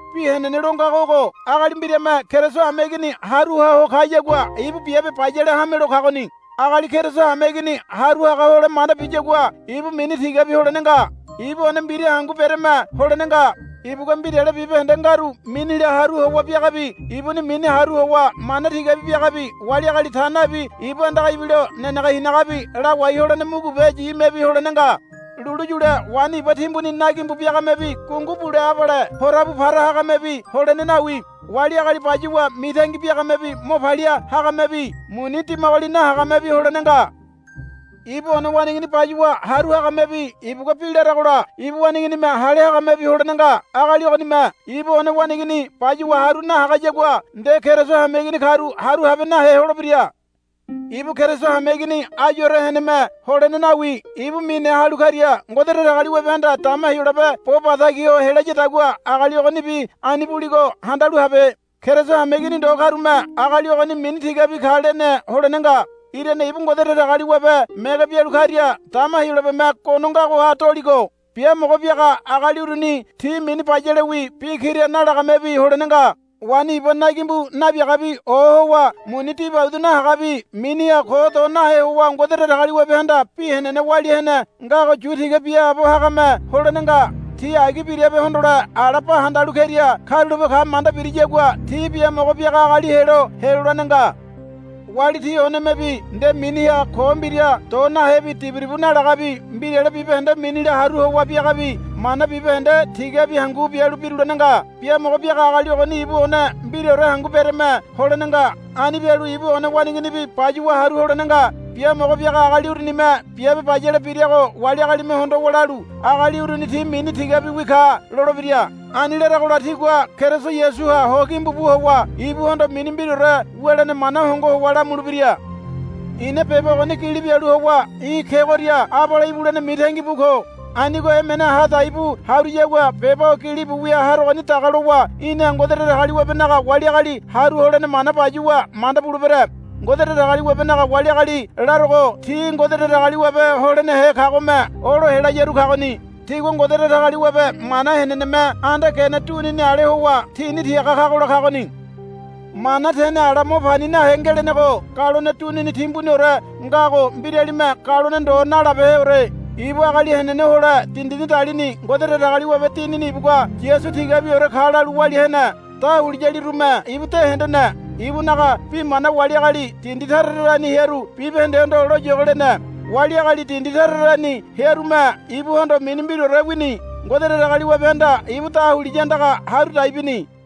Bi henene lo ngago ogo. Agali mbirame Keriso hameigini haru hoa ho kayagua ibu biabe bayale hamelo kagoni. Agali Keriso hameigini haru haga hole manda biyagua ibu mini tigabi holene nga. Ibu one mbira hangu bereme holene nga. Ibugua mbirale bibahende ngaru minila haru howa biagabi ibuni mini haru howa mana tigabi biagabi wali agali ta nabi ibu andaga ibilo nenege hinagabi lawai holene mugubeyimebi holene nga. Lulu yule waini iba timbuni nagimbu biagamebi gungu bule abale porabu para hagamebi holene nawi. Wali agali bayuwa mitangi biagamebi mo palia hagamebi muni dimagoli nahagamebi holene nga. Ibu one waneigini bayuwa haru hagamebi ibugua bi laragola ibu waneiginime hale hagamebi holene nga. Agali ogonime ibu one waneigini bayuwa haru nahagayagua nde Keriso hameigini karu haru habe nahe holebira. Ibu Keriso hameigini ayure heneme holene nawi. Ibu mine halu karia Ngode Datagaliwabehanda dama Heyolabe bo batagi ho helayadagua agali ogonibi ani buligo handalu habe. Keriso hameigini ndo karume agali ogoni mini tigabi ka lene holene nga. Irane ibu Ngode Datagaliwabe mege bialu karia dama Heyolabeme gono ngagoha doligo. Biamogo biaga agaliruni ti mini bayalewi bi kira nalagamebi holene nga. Waini iba nagimbu nabiagabi ohowa muni dibaudu nahagabi miniha ko do nahe howa Ngode Datagaliwabehanda bi henene walia hene ngago yu tiga biaabo hagame holene nga. Ti agi birabe hondole ala ba handalu keria karulape ka manda biriyagua ti biamogo biaga agali helo helolene nga. Wali ti onemebi nde miniha ko mbira do nahebi diburibu nalagabi mbirale bibahende minila haru howa biagabi mana bibahende tigabi hangu bialu birulene nga. Biamogo biaga agali ogoni ibu one mbiraore hangu bereme holene nga. Ani bialu ibu one waneiginibi bayuwa haru holene nga. Biamogo biaga agali urunime biabe bayale birago wali agalime hondowa lalu, Agali uruni ti mini tigabiwi ka, lolebira. Ani laragola tigua Keriso Yasuha ho gimbu bu howa ibuhondo mini mbiraore wulene mana hongo howa lamulebira. I̱na beba ogoni gili bialu howa í̠ kegoria abale ibulene mitangi bu ko. Anigo emene ha dai bu haruyagua beba o gilibu wia harogoni daga lowa i̱na Ngode Datagaliwabenaga wali agali haru holene mana bayuwa manda bulebere. Ngode Datagaliwabenaga wali agali larogo ti Ngode Datagaliwabe holenehe kagome olo helayaru kagoni. Tigua Ngode Datagaliwabe mana heneneme anda gene dunini ale howa tini tiaga kagola kagoni. Mana tene ala mo pani nahe ngelenego galone dunini timbuniore ngago mbiralime galone ndo nalabeheore. Ibu agali henene hole dindini dalini. Ngode Datagaliwabe Dinini ibugua Yasu tigabiore ka lalu walia hene. Dahuliyalirume ibu de hendene. Ibunaga bi mana wali agali dindi tara tarani hearu bibahendehondo loyogo lene. Wali agali dindi tara tarani hearume ibuhondo mini mbiraore wini. Ngode Datagaliwabehanda ibu dahuliya andaga haru dai bini.